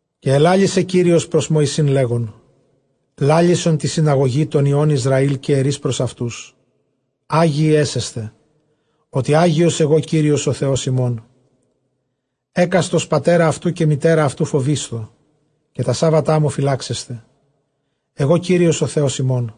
Καὶ ἐλάλησε Κύριος πρὸς Μωυσῆν, λέγων, λάλησον τῇ συναγωγῇ τῶν υἱῶν Ἰσραὴλ, καὶ ἐρεῖς πρὸς αὐτοῦς, ἅγιοι ἔσεσθε, ὅτι ἅγιος ἐγὼ Κύριος ὁ Θεὸς ὑμῶν. Ἕκαστος πατέρα αὐτοῦ καὶ μητέρα αὐτοῦ φοβείσθω, καὶ τὰ σάββατά μου φυλάξεσθε· ἐγὼ Κύριος ὁ Θεὸς ὑμῶν.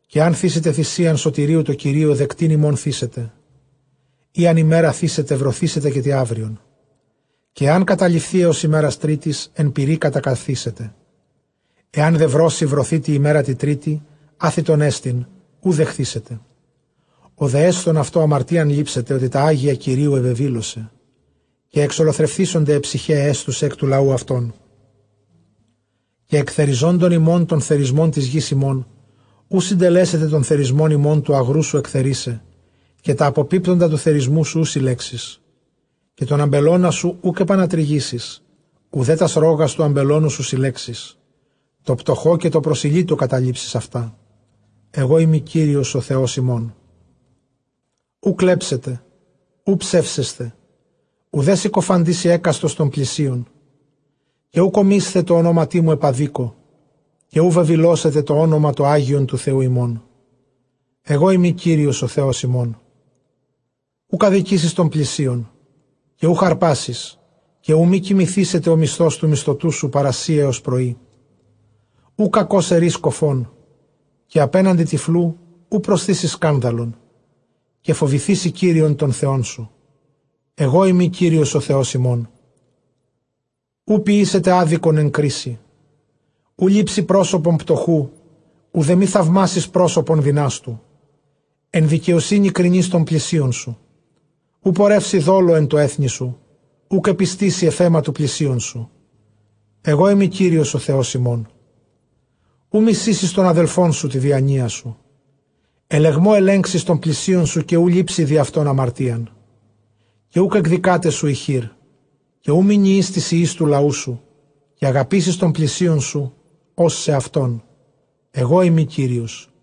Καὶ ἐὰν θύσητε θυσίαν σωτηρίου τῷ Κυρίῳ, δεκτὴν ὑμῶν θύσετε. ᾟ ἂν ἡμέρᾳ θύσετε, βρωθήσεται, καὶ τῇ αὔριον· καὶ ἐὰν καταλειφθῇ ἕως ἡμέρας τρίτης, ἐν πυρὶ κατακαυθήσεται. Ἐὰν δὲ βρώσει βρωθῇ τῇ ἡμέρᾳ τῇ τρίτῃ, ἄθυτόν ἐστιν, οὐ δεχθήσεται. Ὁ δὲ ἔσθων αὐτὸ, ἁμαρτίαν λήψεται, ὅτι τὰ ἅγια Κυρίου ἐβεβήλωσε· καὶ ἐξολοθρευθήσονται αἱ ψυχαὶ αἱ ἔσθουσαι ἐκ τοῦ λαοῦ αὐτῶν. Καὶ ἐκθεριζόντων ὑμῶν τὸν θερισμὸν τῆς γῆς ὑμῶν, οὐ συντελέσετε τὸν θερισμὸν ὑμῶν τοῦ ἀγροῦ σου ἐκθερίσαι· καὶ τὰ ἀποπίπτοντα τοῦ θερισμοῦ σου οὐ συλλέξεις, καὶ τὸν ἀμπελῶνά σου οὐκ ἐπανατρυγήσεις, οὐδὲ τὰς ῥῶγας τοῦ ἀμπελῶνός σου συλλέξεις· τῷ πτωχῷ καὶ τῷ προσηλύτῳ καταλείψεις αὐτά. ἐγώ εἰμι Κύριος ὁ Θεὸς ὑμῶν. Οὐ κλέψετε, οὐ ψεύσεσθε, οὐδὲ συκοφαντήσει ἕκαστος τὸν πλησίον. Καὶ οὐκ ὀμεῖσθε τῷ ὀνόματί μου ἐπʼ ἀδίκῳ, καὶ οὐ βεβηλώσετε τὸ ὄνομα τὸ ἅγιον τοῦ Θεοῦ ὑμῶν· ἐγώ εἰμι Κύριος ὁ Θεὸς ὑμῶν. Οὐκ ἀδικήσεις τὸν πλησίον, καὶ οὐχ ἁρπᾷ· καὶ οὐ μὴ κοιμηθήσεται ὁ μισθὸς τοῦ μισθωτοῦ σου παρὰ σοὶ ἕως πρωΐ. Οὐ κακῶς ἐρεῖς κωφόν, καὶ ἀπέναντι τυφλοῦ οὐ προσθήσεις σκάνδαλον· καὶ φοβηθήσῃ Κύριον τὸν Θεόν σου· ἐγώ εἰμι Κύριος ὁ Θεὸς ὑμῶν. Οὐ ποιήσετε ἄδικον ἐν κρίσει· οὐ λήψῃ πρόσωπον πτωχοῦ, οὐδὲ μὴ θαυμάσῃς πρόσωπον δυνάστου· ἐν δικαιοσύνῃ κρίνεις τὸν πλησίον σου. Οὐ πορεύσῃ δόλῳ ἐν τῷ ἔθνει σου· οὐκ ἐπιστήσῃ ἐφʼ αἷμα τοῦ πλησίον σου· ἐγώ εἰμι Κύριος ὁ Θεὸς ὑμῶν. Οὐ μισήσεις τὸν ἀδελφόν σου τῇ διανοίᾳ σου· ἐλεγμῷ ἐλέγξεις τὸν πλησίον σου, καὶ οὐ λήψῃ διʼ αὐτὸν ἁμαρτίαν. Καὶ οὐκ ἐκδικᾶταί σου ἡ χείρ· καὶ οὐ μηνιεῖς τοῖς υἱοῖς τοῦ λαοῦ σου· καὶ ἀγαπήσεις τὸν πλησίον σου ὡς σεαυτόν· ἐγώ εἰμι Κύριος.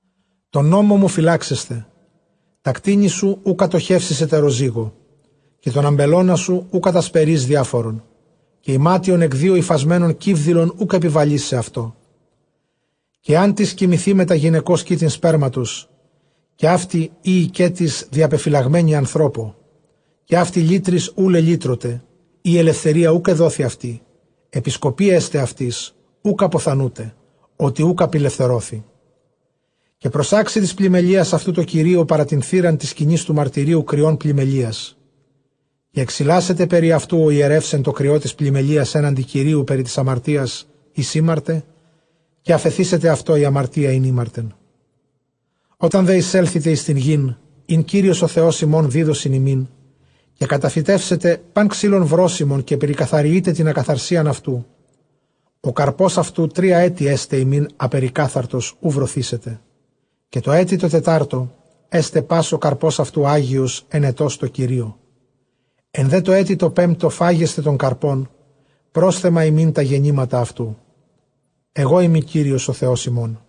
Τὸν νόμον μου φυλάξεσθε· τὰ κτήνη σου οὐ κατοχεύσεις ἑτεροζύγῳ· καὶ τὸν ἀμπελῶνά σου οὐ κατασπερεῖς διάφορον· καὶ ἱμάτιον ἐκ δύο ὑφασμένον κίβδηλον οὐκ ἐπιβαλεῖς σεαυτῷ. Καὶ ἐάν τις κοιμηθῇ μετὰ γυναικὸς κοίτην σπέρματος, καὶ αὕτη ᾖ οἰκέτις διαπεφυλαγμένη ἀνθρώπῳ, καὶ αὕτη λύτροις οὐ λελύτρωται, ἢ ἐλευθερία οὐκ ἐδόθη αὐτῇ, ἐπισκοπὴ ἔσται αὐτοῖς· οὐκ ἀποθανοῦνται, ὅτι οὐκ ἀπηλευθερώθη. Καὶ προσάξει τῆς πλημμελείας αὐτοῦ τῷ Κυρίῳ παρὰ τὴν θύραν τῆς σκηνῆς τοῦ μαρτυρίου κριὸν πλημμελείας. Καὶ ἐξιλάσεται περὶ αὐτοῦ ὁ ἱερεὺς ἐν τῷ κριῷ τῆς πλημμελείας ἔναντι Κυρίου περὶ τῆς ἁμαρτίας ἧς ἥμαρτε, καὶ ἀφεθήσεται αὐτῷ ἡ ἁμαρτία ἣν ἥμαρτεν. Ὅταν δὲ εἰσέλθητε εἰς τὴν γῆν, ἣν Κύριος ὁ Θεὸς ὑμῶν δίδωσιν ὑμῖν, καὶ καταφυτεύσετε πᾶν ξύλον βρώσιμον, καὶ περικαθαριεῖτε τὴν ἀκαθαρσίαν αὐτοῦ· ὁ καρπὸς αὐτοῦ τρία ἔτη ἔσται ὑμῖν ἀπερικάθαρτος, οὐ βρωθήσεται. Καὶ τῷ ἔτει τῷ τετάρτῳ ἔσται πᾶς ὁ καρπὸς αὐτοῦ ἅγιος αἰνετὸς τῷ Κυρίῳ. Ἐν δὲ τῷ ἔτει τῷ πέμπτῳ φάγεσθε τὸν καρπόν, πρόσθεμα ὑμῖν τὰ γεννήματα αὐτοῦ· ἐγώ εἰμι Κύριος ὁ Θεὸς ὑμῶν.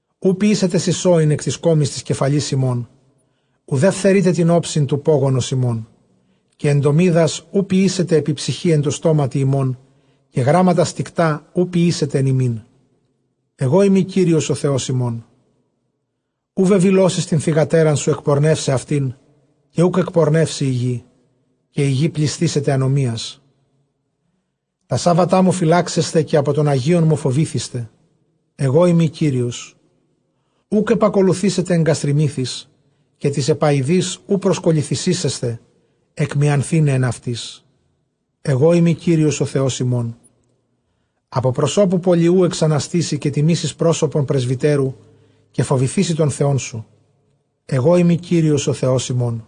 Οὐ ποιήσετε σισόην ἐκ τῆς κόμης τῆς κεφαλῆς ὑμῶν, οὐδὲ φθερεῖτε τὴν ὄψιν τοῦ πώγωνος ὑμῶν. Καὶ ἐντομίδας οὐ ποιήσετε ἐπὶ ψυχῇ ἐν τῷ σώματι ὑμῶν· καὶ γράμματα στικτὰ οὐ ποιήσετε ἐν ὑμῖν· ἐγώ εἰμι Κύριος ὁ Θεὸς ὑμῶν. Οὐ βεβηλώσεις τὴν θυγατέρα σου ἐκπορνεῦσαι αὐτήν· καὶ οὐκ ἐκπορνεύσει ἡ γῆ, καὶ ἡ γῆ πλησθήσεται ἀνομίας. Τὰ σάββατά μον φυλάξεσθε, καὶ ἀπὸ τῶν ἁγίων μου φοβηθήσεσθε· ἐγώ εἰμι Κύριος. Οὐκ ἐπακολουθήσετε ἐγγαστριμύθοις, καὶ τοῖς ἐπαοιδοῖς οὐ προσκολληθήσεσθε, ἐκμιανθῆναι ἐν αὐτοῖς· ἐγώ εἰμι Κύριος ὁ Θεὸς ὑμῶν. Ἀπὸ προσώπου πολιοῦ ἐξαναστήσῃ, καὶ τιμήσεις πρόσωπον πρεσβυτέρου, καὶ φοβηθήσῃ τὸν Θεόν σου· ἐγώ εἰμι Κύριος ὁ Θεὸς ὑμῶν.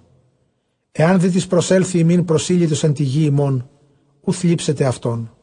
Ἐὰν δέ τις προσέλθῃ ὑμῖν προσήλυτος ἐν τῇ γῇ ὑμῶν, οὐ θλίψετε αὐτόν.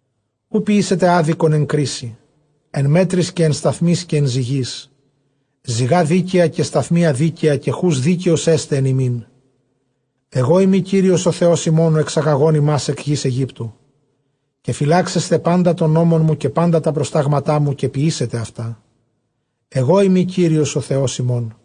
Οὐ ποιήσετε ἄδικον ἐν κρίσει, ἐν μέτροις καὶ ἐν σταθμίοις καὶ ἐν ζυγοῖς. Ζυγὰ δίκαια καὶ σταθμία δίκαια καὶ χοῦς δίκαιος ἔσται ἐν ὑμιν· ἐγώ εἰμι Κύριος ὁ Θεὸς ὑμῶν, ὁ ἐξαγαγὼν ὑμᾶς ἐκ γῆς Αἰγύπτου. Καὶ φυλάξεσθε πάντα τὸν νόμον μου, καὶ πάντα τὰ προστάγματά μου, καὶ ποιήσετε αὐτά· ἐγώ εἰμι Κύριος ὁ Θεὸς ὑμῶν.